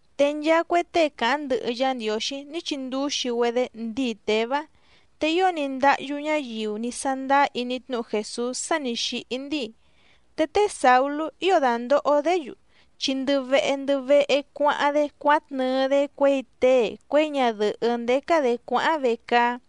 Te nchaa cue tée càháⁿ ndɨhɨ Yá Ndiǒxí ní chindúxi‑güedé ndíi Těvá. Te ío ní ndáhyú ñáyiu ní sándáá iní tnúhu Jèsús sá nǐ xíhí ndíi. Te té Sàulú ío dàndoho‑dé‑yu, chi ndɨ vehe ndɨ vehe cuáháⁿ‑dé cuátnɨɨ‑dé cuěi tée cuěi ñadɨ̀hɨ́ ndécá‑dě cuáháⁿ vecaá.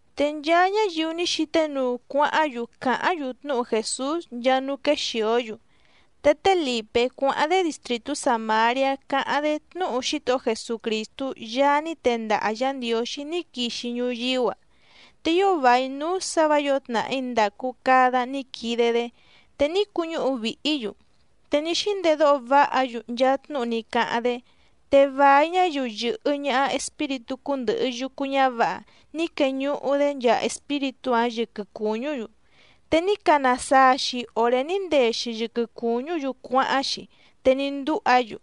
Te nchaa ñáyiu ní xíté nuu cuáháⁿ‑yu càháⁿ‑yu tnúhu Jèsús nchaa núú quéxìó‑yu. Te té Lìpé cuáháⁿ‑dé distrìtú Sàmariá càháⁿ‑dé tnúhu Xítohó Jesucrìstú Yaá ní tendaha Yǎ Ndiǒxí ní quixi ñuyíú‑a. Te ío vài núú sǎ vǎ yǒo tnàhí ndàcu cada ní quide‑dé, te ní cuñúhu vìhí‑yu, te ní xíndedóho váha‑yu nchaa tnúhu ní cáháⁿ‑dé. Te vài ñáyiu yɨ̀hɨ ñaha espíritú cúndɨ̀hɨ yucu ñávǎha ní queñuhu‑dé nchaa espíritú‑áⁿ yɨquɨ cùñú‑yu, te ní cana saa‑xi òré ní ndee‑xi yɨquɨ cùñú‑yu cuáháⁿ‑xi, te ní ndúha‑yu.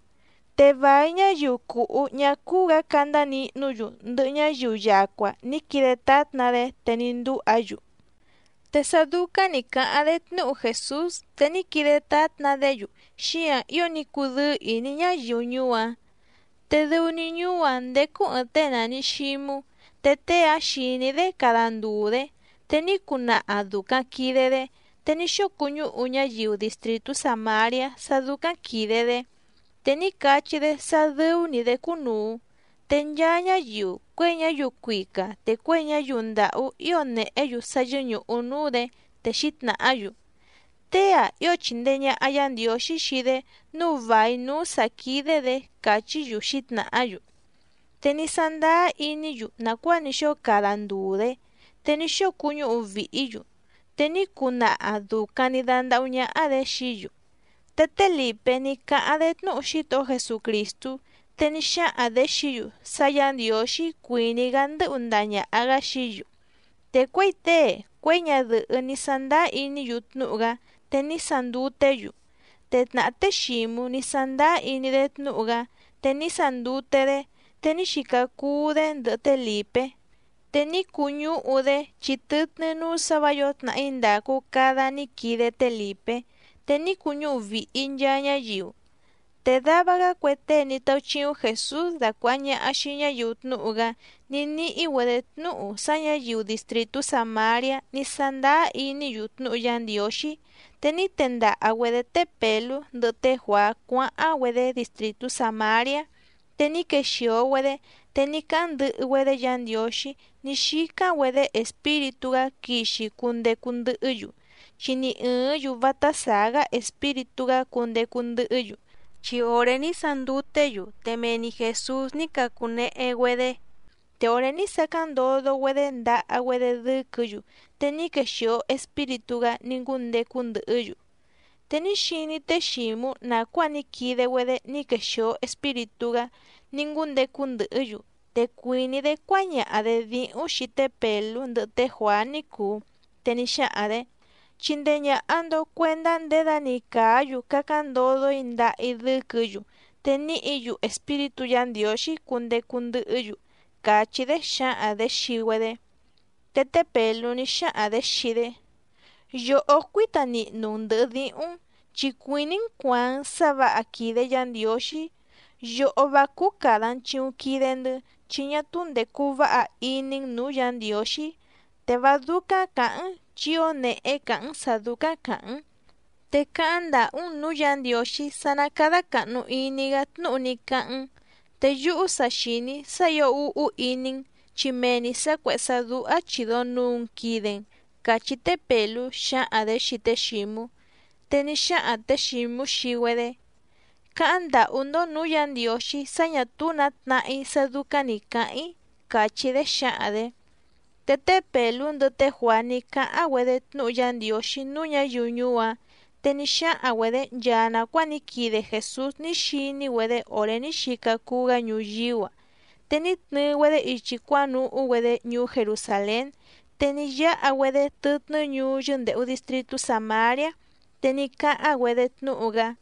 Te vài ñáyiu cùhú ñá cúú‑gǎ candá nihnú‑yu ndɨhɨ ñáyiu yacua ní quide tátna‑dé, te ní ndúha‑yu. Te sá dúcáⁿ nǐ cáháⁿ‑dé tnúhu Jèsús te ní quide tátna‑dé‑yu, xíǎⁿ ío ní cudɨ́ɨ́ ìní ñáyiu ñuú‑áⁿ. Te dɨu‑ni ñuú‑áⁿ ndécú ɨ̀ɨⁿ tée nàni Xímú, te tée‑áⁿ xìní‑dé cada ndùu‑dé, te ní cuu naha dùcaⁿ quide‑dé, te ní xóo cuñúhu ñáyiu distrìtú Sàmariá sá dúcáⁿ quìde‑dé, te ní cachí‑dé sá dɨ́ú‑ní‑dě cúnùu. Te nchaa ñáyiu cuěi ñáyiu cuica te cuěi ñáyiu ndàhú ío nèhé‑yu sá yɨ́ñùhu núú‑dě, te xǐtnàhá‑yu: —Tée‑ǎⁿ ío chìndee ñaha Yá Ndiǒxí xii‑dé nǔu vài núú sǎ quídé‑dě —càchí‑yu xǐtnàhá‑yu. Te ní sándáá iní‑yu nàcuáa ní xóo cada ndùu‑dé, te ní xóo cuñúhu vìhí‑yu, te ní cuu naha dùcaⁿ‑ni dandahú ñáhá‑dě xií‑yu. Te té Lìpé ní cáháⁿ‑dé tnúhu Xítohó Jesucrìstú, te ní xáhaⁿ‑dě xií‑yu sá Yǎ Ndiǒxí cuìní‑gá ndɨ́hu ndaha ñàha‑gá xií‑yu. Te cuěi tée cuěi ñadɨ̀hɨ́ ní sándáá iní‑yu tnúhu‑gá, te ní sanduté‑yu. Te tnàhá té Xǐmú ní sándáá iní‑dé tnúhu‑gá, te ní sandute‑dé, te ní xica cuu‑dé ndɨhɨ té Lìpé, te ní cuñúhu‑dé chi tɨtnɨ́ núú sǎ vǎ yǒo tnàhí ndàcu cada ní quide té Lìpé, te ní cuñúhu vìhi nchaa ñáyiu. Te dava‑gá cue tée ní táúchíúⁿ Jèsús dacuàha ñaha xii ñáyiu tnúhu‑gá ní níhí‑güedě tnúhu sá ñǎyiu distrìtú Sàmariá ní sándáá iní‑yu tnúhu Yá Ndiǒxí. Te ní tendaha‑güedě té Pèlú ndɨhɨ té Juàá cuáháⁿ‑güedé distrìtú Sàmariá. Te ní quexìo‑güedé, te ní cáháⁿ ndɨhɨ‑güedé Yǎ Ndiǒxí ní xícáⁿ‑güedé Espíritú‑gá quixi cundecu ndɨhɨ́‑yu. Chi ni ɨ̀ɨ́ⁿ‑yu vátá sàá‑gá Espíritú‑gá cundecu ndɨhɨ́‑yu, chi òré ní sanduté‑yu, te mee‑ni Jèsús ní cacunehe‑güedé. Te òré ní sacáⁿ ndodo‑güedé ndaha‑güedé dɨ́quɨ̌‑yu, te ní quexìo Espíritú‑gá ní ngúndecu ndɨhɨ́‑yu. Te ní xiní té Xǐmú nàcuáa ní quide‑güedé ní quexìo Espíritú‑gá ní ngúndecu ndɨhɨ́‑yu, te cuìní‑dé cuáñaha‑dě díhúⁿ xii té Pèlú ndɨhɨ té Juàá ní cùu. Te ní xáhaⁿ‑dě: —Chindee ñàha‑ndo cuendá nděda‑ni càá‑yu cacáⁿ ndodo‑í ndaha‑í dɨ́quɨ̌‑yu, te níhǐ‑yu Espíritú Yǎ Ndiǒxí cundecu ndɨhɨ́‑yu —càchí‑dé xǎhaⁿ‑dě xii‑güedé. Te té Pèlú ní xáhaⁿ‑dě xii‑dé: —Yòhó cuíta nihnu‑n ndɨ̀hɨ díhúⁿ‑n, chi cuìní‑n cuàaⁿ‑n sá vǎha quìde Yá Ndiǒxí. Yòhó vá cúú càda‑n chiuⁿ quide‑ndɨ́, chi ñá túú ndècu váha iní‑n nǔú Yǎ Ndiǒxí. Te vá dúcáⁿ cǎháⁿ‑n, chi ío nèhé càháⁿ‑n sǎ dúcáⁿ càháⁿ‑n. Te cáháⁿ ndàhú‑n nǔú Yǎ Ndiǒxí sá ná cádá càhnu iní‑gá tnúhu ní cáháⁿ‑n. Te yúhú sa xìní‑í sá ǐo úhú iní‑n, chi mee‑ni sǎ cuèhé sá dúhá chìdo nuu‑n quide‑n —cachí té Pèlú xǎhaⁿ‑dě xii té Xǐmú. Te ní xáhaⁿ tě Xǐmú xii‑güedé: —Cáháⁿ ndàhú‑ndó nǔú Yǎ Ndiǒxí sá ñà túú nǎ tnahá‑í sá dúcáⁿ nǐ cáháⁿ‑í —càchí‑dé xǎhaⁿ‑dě. Te té Pèlú ndɨhɨ té Juàá ní cáháⁿ‑güedé tnúhu Yá Ndiǒxí núú ñǎyiu ñuú‑áⁿ. Te ní xáhaⁿ‑güedě nchaa nàcuáa ní quide Jèsús ní xiní‑güedé òré ní xica cuu‑gá ñuyíú‑a. Te ní tnɨɨ‑güedé ichi cuánuhú‑güedé ñuú Jerusàlén, te ní yáha‑güedé tɨtnɨ́ ñuú yɨ́ndèhu distritú Sàmariá, te ní cáháⁿ‑güedé tnúhu‑gá.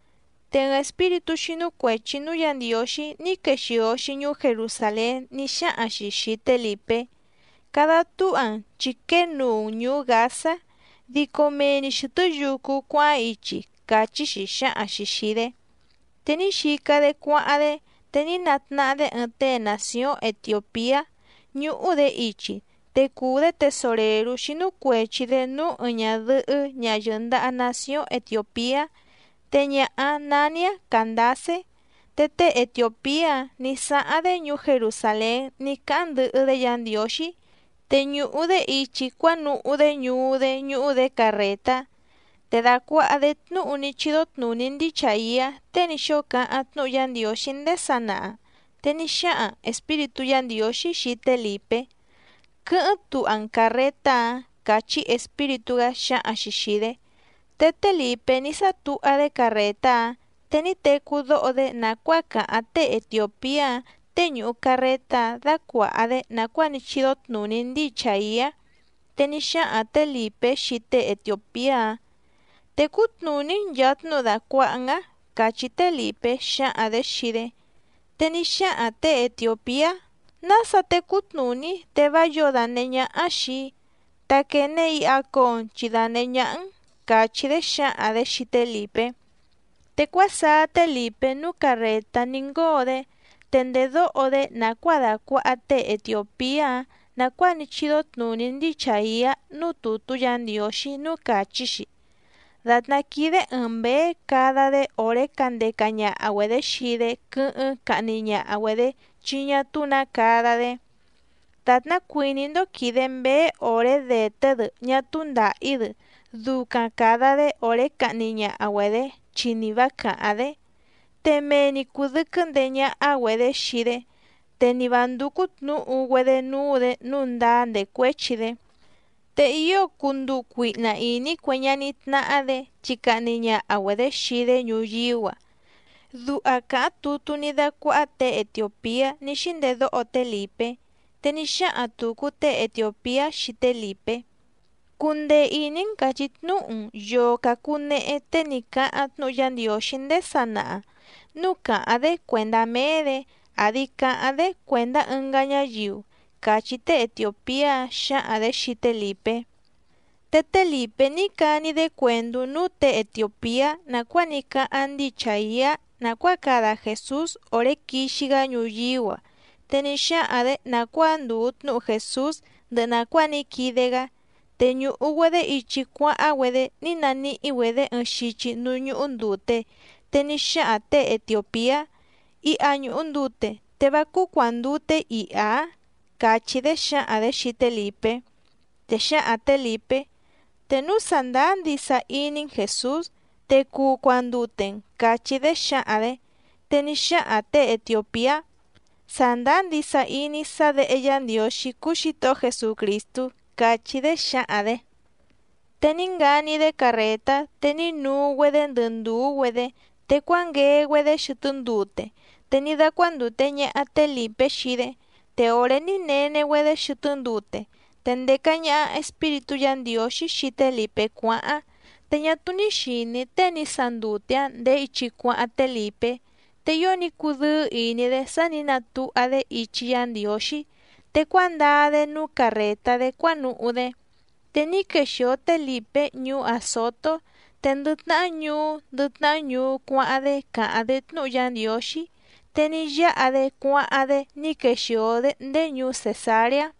Te ɨɨⁿ espíritú xínú cuèchi núú Yǎ Ndiǒxí ní quexìo‑xi ñuú Jerusàlén ní xáhaⁿ‑xi xìi té Lìpé: —Cada túha‑n chi quée nuu‑n ñùú Gǎzá, dico mee‑ni xɨ̀tɨ́ yucu cuáháⁿ ichi —càchí‑xi xǎhaⁿ‑xi xìi‑dé. Te ní xica‑dé cuáháⁿ‑dé, te ní natnahá‑dé ɨɨⁿ tée nàcióⁿ Etiòpiá ñúhú‑dě ichi. Te cùu‑dé tesorèrú xínú cuèchi‑dé núú ɨɨⁿ ñadɨ̀hɨ́ ñaha yɨ̀ndaha nacióⁿ Etiòpiá, te ñaha‑áⁿ nání‑áⁿ Càndacé. Te tée etiòpiá‑áⁿ nǐ sáháⁿ‑dé ñuú Jerusàlén ní cáháⁿ ndɨhɨ‑dé Yǎ Ndiǒxí, te ñùhu‑dé ichi cuánuhú‑dé ñuú‑dé ñúhú‑dě carrètá, te dàcuaha‑dé tnúhu ní chídó tnùní ndíi Chàiá tée ní xóo cáháⁿ tnúhu Yá Ndiǒxí ndéé sanaha. Te ní xáhaⁿ Espíritú Yǎ Ndiǒxí xii té Lìpé: —Quɨ́hɨ́ⁿ tuha‑n càrretá‑ǎⁿ —càchí Espíritú‑gá xǎhaⁿ‑xi xìi‑dé. Te té Lìpé ní sátuha‑dé carrètá‑áⁿ, te ní tecú dóho‑dé nàcuáa càháⁿ tée etiòpiá‑áⁿ, tée ñùhu carretá‑áⁿ dácuàha‑dé nàcuáa ní chídó tnùní ndíi Chàiá. Te ní xáhaⁿ tě Lìpé xii tée etiòpiá‑áⁿ: —¿Tècú tnùní‑n nchàa tnúhu dàcuaha‑n‑áⁿ? —càchí té Lìpé xǎhaⁿ‑dě xii‑dé. Te ní xáhaⁿ těe etiòpiá: —¿Nása tecú tnùní‑í te vá yǒo dànehé ñáhá xìi‑í? Ta quène iha coo‑n chi danèhé ñáhá‑n —càchí‑dé xǎhaⁿ‑dě xii té Lìpé. Te cuásaá té Lìpé núú carrètá ní ngóo‑dé. Te ndèdóho‑dé nàcuáa dàcuaha tée etiòpiá‑áⁿ nàcuáa ní chídó tnùní ndíi Chàiá núú tùtú Yǎ Ndiǒxí núú càchí‑xi: Dàtná quídé ɨ̀ɨⁿ mbéé cada‑dé òré candeca ñaha‑güedě xii‑dé quɨ́hɨ́ⁿ cahni ñaha‑güedě chi ñá túú nǎ cada‑dé, dàtná cuìní‑ndó quìde mbéé òré dèté‑dɨ ñá túú ndàhí‑dɨ ducaⁿ càda‑dé òré cahni ñaha‑güedě chi ni vǎ càháⁿ‑dé. Te mee‑ni cùdɨquɨ́ ndeé ñáhá‑güedě xii‑dé, te ni vǎ ndúcú tnǔhu‑güedé núú‑dě nǔu ndáá ndècuéchi‑dé. Te ío cuu nduu cuihna ìní cue ñaní tnáhá‑dě, chi cahni ñaha‑güedě xii‑dé ñuyíú‑a. Duha càháⁿ tutú ní dácuáhá těe etiòpiá ní xíndedóho té Lìpé. Te ní xáhaⁿ tùcu tée Etiòpiá xii té Lìpé: —Cundee ìní‑n càchí tnúhu‑n yòo cacunehe tée ní cáháⁿ tnúhu Yá Ndiǒxí ndéé sanaha, núu càháⁿ‑dé cuèndá méé‑dě àdi caháⁿ‑dé cuèndá ɨngá ñáyiu —càchí tée etiòpiá‑áⁿ xǎhaⁿ‑dě xii té Lìpé. Te té Lìpé ní cani‑dé cuèndú núú těe etiòpiá nàcuáa ní cáháⁿ ndíi Chàiá nàcuáa cada Jèsús òré quixi‑gá ñuyíú‑a. Te ní xáhaⁿ‑dě nàcuáa ndùu tnúhu Jèsús ndɨhɨ nàcuáa ní quide‑gá. Te ñùhu‑güedé ichi cuáháⁿ‑güedé ní naníhí‑güedě ɨɨⁿ xichi núú ñúhú ndùte, te ní xáhaⁿ těe etiòpiá: —Iha ñùhu ndute, ¿te vá cúú cuàndute‑í iha‑ǎⁿ? —càchí‑dé xǎhaⁿ‑dě xii té Lìpé. Te xǎhaⁿ tě Lìpé: —Te núu sàndáá ndisa iní‑n Jèsús, te cuu cuandute‑n —càchí‑dé xǎhaⁿ‑dě. Te ní xáhaⁿ těe etiòpiá: —Sàndáá ndisa iní‑í sá Děhe Yá Ndiǒxí cúú Xǐtohó Jesucrìstú —càchí‑dé xǎhaⁿ‑dě. Te ní ngani‑dé carrètá, te ní nuu‑güedé ndɨ ndùú‑güedé, te cuánguee‑güedé xɨtɨ́ ndute, te ní dácuándùte ñaha té Lìpé xii‑dé. Te òré ní nene‑güedé xɨtɨ́ ndute, te ndèca ñaha Espíritú Yǎ Ndiǒxí xii té Lìpé cuáháⁿ. Te ñá túú ní xìní tée ní sandute‑áⁿ ndèé ichi cuáháⁿ té Lìpé. Te ío ní cudɨ́ɨ́ ìní‑dé sá nǐ natuha‑dé ichi Yá Ndiǒxí, te cuándaa‑dé núú carrètá‑dé cuánuhú‑dé. Te ní quexìo té Lìpé ñuú Àzotó, te ndɨ tnahá ñuú ndɨ tnahá ñuú cuáháⁿ‑dé càháⁿ‑dé tnúhu Yá Ndiǒxí, te ní yáha‑dé cuáháⁿ‑dé ní quexìo‑dé ndéé ñuú Cèsareá.